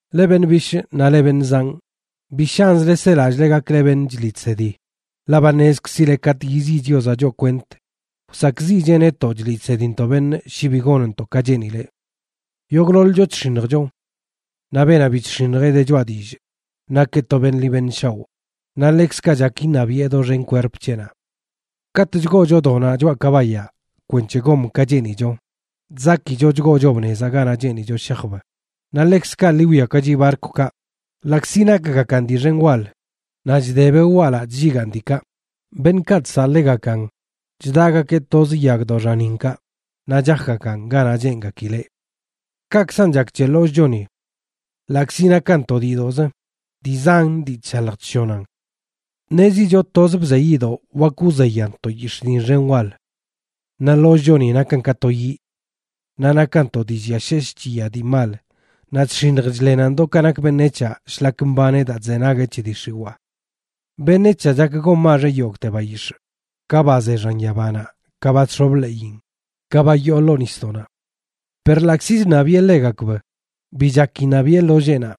Leꞌ beṉꞌ bishꞌ naꞌ leꞌ beṉꞌ zanꞌ, bi shanzle selallꞌle gakle beṉꞌ chliꞌ chsedi, ḻaꞌ ba ṉezkzileꞌ katꞌ yiziꞌ Chiozaꞌ choꞌ kwent wsakꞌziꞌcheꞌ netoꞌ chliꞌ chsedintoꞌ beṉꞌ shi bi gonntoꞌ ka cheenileꞌ. Yogꞌḻoḻcho chx̱iṉjcho. Naꞌ beenaꞌ bi chx̱iṉjeꞌ de choꞌa dillꞌ nakeꞌ to beṉꞌ ḻi beṉꞌ shaoꞌ, naꞌ ḻekzkaꞌ chak iṉabiꞌe doxen kwerp c̱heꞌnaꞌ. Katꞌ chgoocho donaꞌ choꞌa kabayaꞌ kwenc̱he gom ka cheenicho, chzakicho chgoochob nezaꞌ ganaꞌ cheenicho shajb. Naꞌ ḻekzkaꞌ ḻi wwiakachi barkwkaꞌ, ḻaꞌkzi nakgakan dii xen wal naꞌ chde beꞌ walaꞌ chlligaan diikaꞌ, beṉꞌkaꞌ chsaꞌ ḻegakan chdagakeꞌ toz yagdoꞌ xaninkaꞌ naꞌ chajgakan ganaꞌ cheengakileꞌ. Kaꞌkzan chak c̱he ḻollꞌchoni. Ḻaꞌkzi nakan to diidoꞌzə, dii zan dii chshalj chshonan. Ṉezicho toz bzeyiꞌdoꞌ wak wzeyan to yix̱ꞌ diṉ xen wal. Naꞌ ḻollꞌchoni nakan ka to yiꞌ. Naꞌ nakan to dii lliasheshꞌ chiya dii mal naꞌ chx̱iṉj chḻenan do ka nak beṉec̱haꞌ shlak mbaneꞌ daa chzenagueꞌ c̱he dii xiwaa. Beṉec̱haꞌ chak gonmaxeꞌ yogꞌte bayix̱ꞌ, ka ba ze xan yabanaꞌ, ka ba chx̱ob ḻeꞌin, ka ba yoo ḻoo nisdoꞌnaꞌ. Per ḻaꞌkzi chṉabiꞌe ḻegakb, bi chak iṉabiꞌe ḻolleenaꞌ.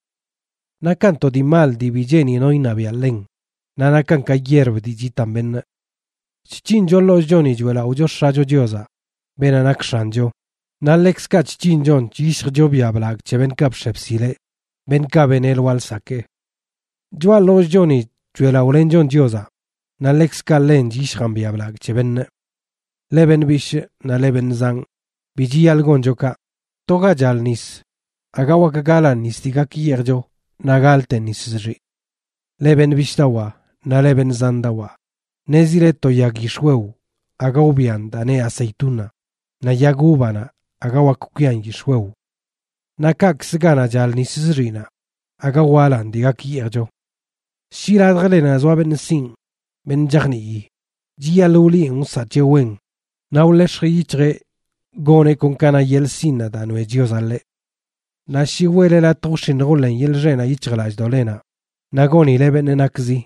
Nakan to dii mal dii bi cheeni no iṉabiaꞌ ḻen, naꞌ nakan ka yierb dii chitan beṉꞌ. Chc̱hincho ḻollꞌchoni choeꞌlaꞌocho X̱acho Chiozaꞌ, beenaꞌ nak X̱ancho, naꞌ ḻekzkaꞌ chc̱hinchon chyishjcho biaꞌ blagꞌ c̱he beṉꞌkaꞌ bx̱e bsileꞌ, beṉꞌkaꞌ beneꞌ lwaa lsakee. Choꞌa ḻollꞌchoni choeꞌlaꞌolenchon Chiozaꞌ naꞌ ḻekzkaꞌ ḻen chyishjan biaꞌ blagꞌ c̱he beṉꞌ. Leꞌ beṉꞌ bishꞌ naꞌ leꞌ beṉꞌ zanꞌ, bi chiyaḻꞌ goncho kaꞌ. To ga chal nis, aga wak galan nis dii gak yeejcho naꞌ galten nis zxiꞌ. Leꞌ beṉꞌ bishꞌdawaa naꞌ leꞌ beṉꞌ zandawaa, ṉezile to yag yix̱wew aga wbian daa neꞌ aceituna, naꞌ yag uvanaꞌ aga wak kwian yix̱wew. Naꞌ kaꞌkzə ganaꞌ chal nis zxiꞌnaꞌ aga walan dii gak yeejcho. Shi ladjlenaꞌ zoa beṉꞌ sinꞌ, beṉꞌ chajnii, chiyaḻꞌ wliꞌen wsaꞌ c̱heꞌ wen naꞌ wḻex̱j yic̱hjeꞌ goneꞌ kon ka na yeḻꞌ sinꞌnaꞌ daa noeꞌ Chiozaꞌ ḻeꞌ. Naꞌ shi weꞌle latj wx̱iṉj wḻen yeḻꞌ xeꞌnaꞌ yic̱hjlallꞌdoꞌlenaꞌ, naꞌ gonile beṉꞌ nakzi,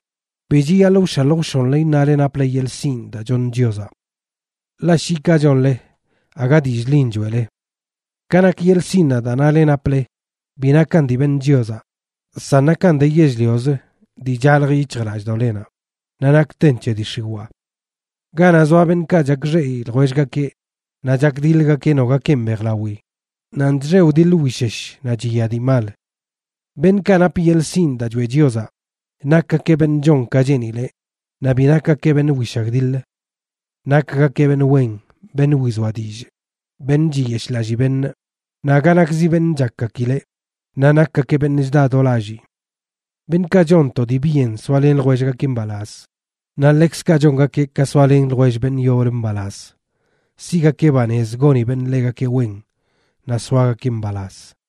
bi chiyaḻꞌ wshalj wshonle iṉale naple yeḻꞌ sinꞌ daa choṉ Chiozaꞌ. Ḻaꞌ shi kaꞌ chonle aga dillꞌ ḻin choeꞌle. Ka nak yeḻꞌ sinꞌnaꞌ daa nale naple, bi nakan dii beṉ Chiozaꞌ, san nakan de yell-liozə dii chalj yic̱hjlallꞌdoꞌlenaꞌ, naꞌ nakten c̱he dii x̱iwaa. Ganaꞌ zoa beṉꞌkaꞌ chakxeꞌi ljwellgakeꞌ naꞌ chakdiḻgakeꞌ nogakenꞌ mbejlawi, nanꞌ chxe wdiḻ wishesh naꞌ chiya dii mal. Beṉꞌkaꞌ nap yeḻꞌ sinꞌ daa choeꞌ Chiozaꞌ, nakgakeꞌ beṉꞌ chon ka cheenileꞌ, naꞌ bi nakgakeꞌ beṉꞌ wishagdiḻ. Nakgakeꞌ beṉꞌ wen, beṉꞌ wizoa dillꞌ, beṉꞌ chiyeshꞌlallii beṉꞌ, naꞌ aga nakzi beṉꞌ chakgakileꞌ, naꞌ nakgakeꞌ beṉꞌ chda do lallii. Beṉꞌkaꞌ chon to dii byen soalen ljwellgakeꞌ mbalaz, naꞌ ḻekzkaꞌ chongakeꞌ ka soalen ljwell beṉꞌ yoblə mbalaz, siꞌgakeꞌ banez goni beṉꞌ ḻegakeꞌ wen, naꞌ soagakeꞌ mbalaz.